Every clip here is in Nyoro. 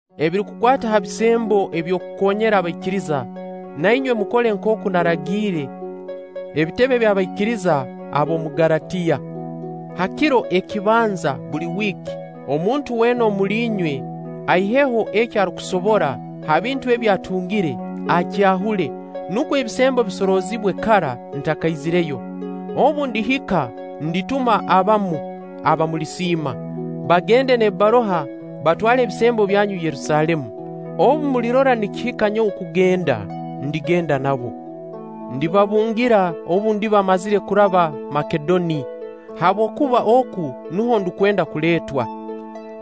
Ebirukukwata ha bisembo eby'okukoonyera abaikiriza, na inywe mukole nkooku naragiire ebitebe by'abaikiriza ab'omu Galatiya. Ha kiro ekibanza buli wiiki, omuntu weena omuli inywe aiheho eki arukusobora ha bintu ebi atungire, akyahule, nukwo ebisembo bisoroozibwe kara ntakaizireyo. Obu ndihika, ndituma abamu aba mulisiima, bagenda n'ebbaruha, batwale ebisembo byanyu Yerusaalemu. Obu mulirora nikihika nyowe kugenda, ndigenda nabo. Ndibabungira obu ndiba mmazire kuraba Makedoni, habwokuba oku nuho ndukwenda kuleetwa.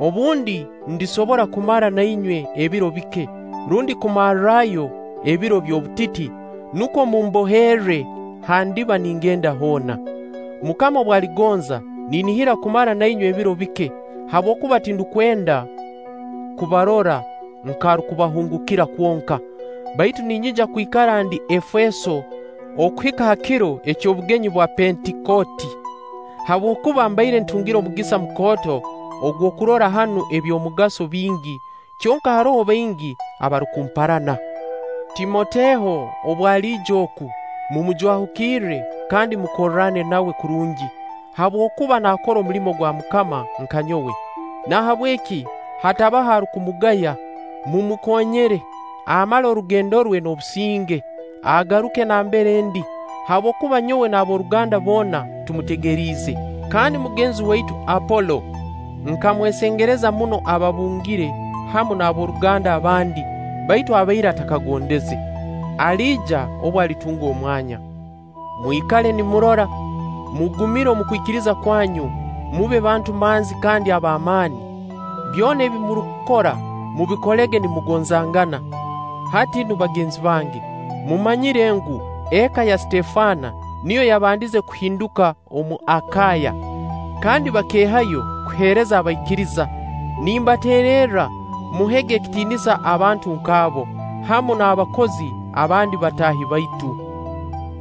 Obundi ndisobora kumara na inywe ebiro bike, rundi kumarrayo ebiro by'obutiti, nukwo mumboherre ha ndiba ningenda hoona. MUKAMA obu aligonza, ninihira kumara na inywe ebiro bike, habwokuba tindukwenda kubarora nk'arukubahungukira kwonka. Baitu ninyija kwikara ndi Efeeso okuhika ha kiro eky'obugenyi bwa Pentikooti, habwokuba mbaire ntungire omugisa mukooto ogw'okukorra hanu eby'omugaso bingi, kyonka haroho baingi abarukumparana. Timoteho obu aliija oku, mumujwahukirre kandi mukorrane nawe kurungi, habwokuba naakora omulimo gwa MUKAMA nka nyowe. Nahabweki hatabaho arukumugaya; mumukoonyere, amale orugendo rwe n'obusinge, agaruke nambere ndi; habwokuba nyowe n'ab'oruganda boona tumutegeriize. Kandi mugenzi waitu Apolo, nkamwesengereza muno ababungire hamu n'ab'oruganda abandi baitu abaire atakagondeze. Aliija obu alitunga omwanya. Mwikale nimurora, mugumire omu kwikiriza kwanyu, mube bantu manzi kandi ab'amaani. Byona ebi murukukora, mubikolege nimugonzangana. Hati nu, bagenzi bange, mumanyire ngu, eka ya Sitefana niyo yabandize kuhinduka omu Akaaya kandi bakeehayo kuheereza abaikiriza; nimbateererra muhege ekitiinisa abantu nk'abo, hamu n'abakozi abandi bataahi baitu.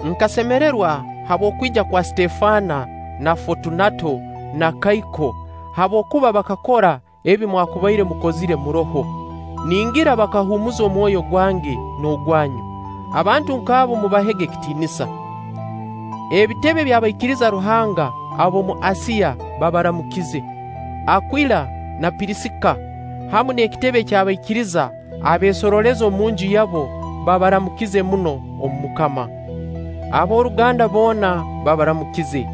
Nkasemererwa habw'okwija kwa Sitefana na Fotunato n'Akaiko, habwokuba bakakora ebi mwakubaire mukozire muroho; ningira bakahumuuza omwoyo gwange n'ogwanyu. Abantu nk'abo mubahege ekitiinisa. Ebitebe by'abaikiriza Ruhanga ab'omu Asiya babaramukize. Akwila na Pirisika, hamu n'ekitebe ky'abaikiriza abeesorooleza omunju yabo babaramukize muno omu MUKAMA. Ab'oruganda boona babaramukize.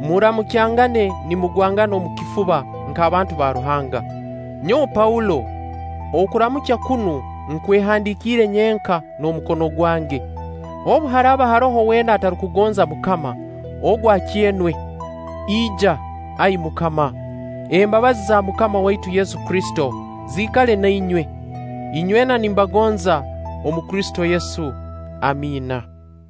Muramukyangane nimugwangana omu kifuba nk'abantu ba Ruhanga. Nyowe Paulo, okuramukya kunu nkwehandikiire nyenka n'omukono gwange. Obu haraaba haroho weena atarukugonza MUKAMA, ogu akyenwe. Ija, Ai MUKAMA! Embabazi za MUKAMA waitu Yesu Kristo ziikale na inywe. Inywena nimbagonza omu Kristo Yesu. Amiina.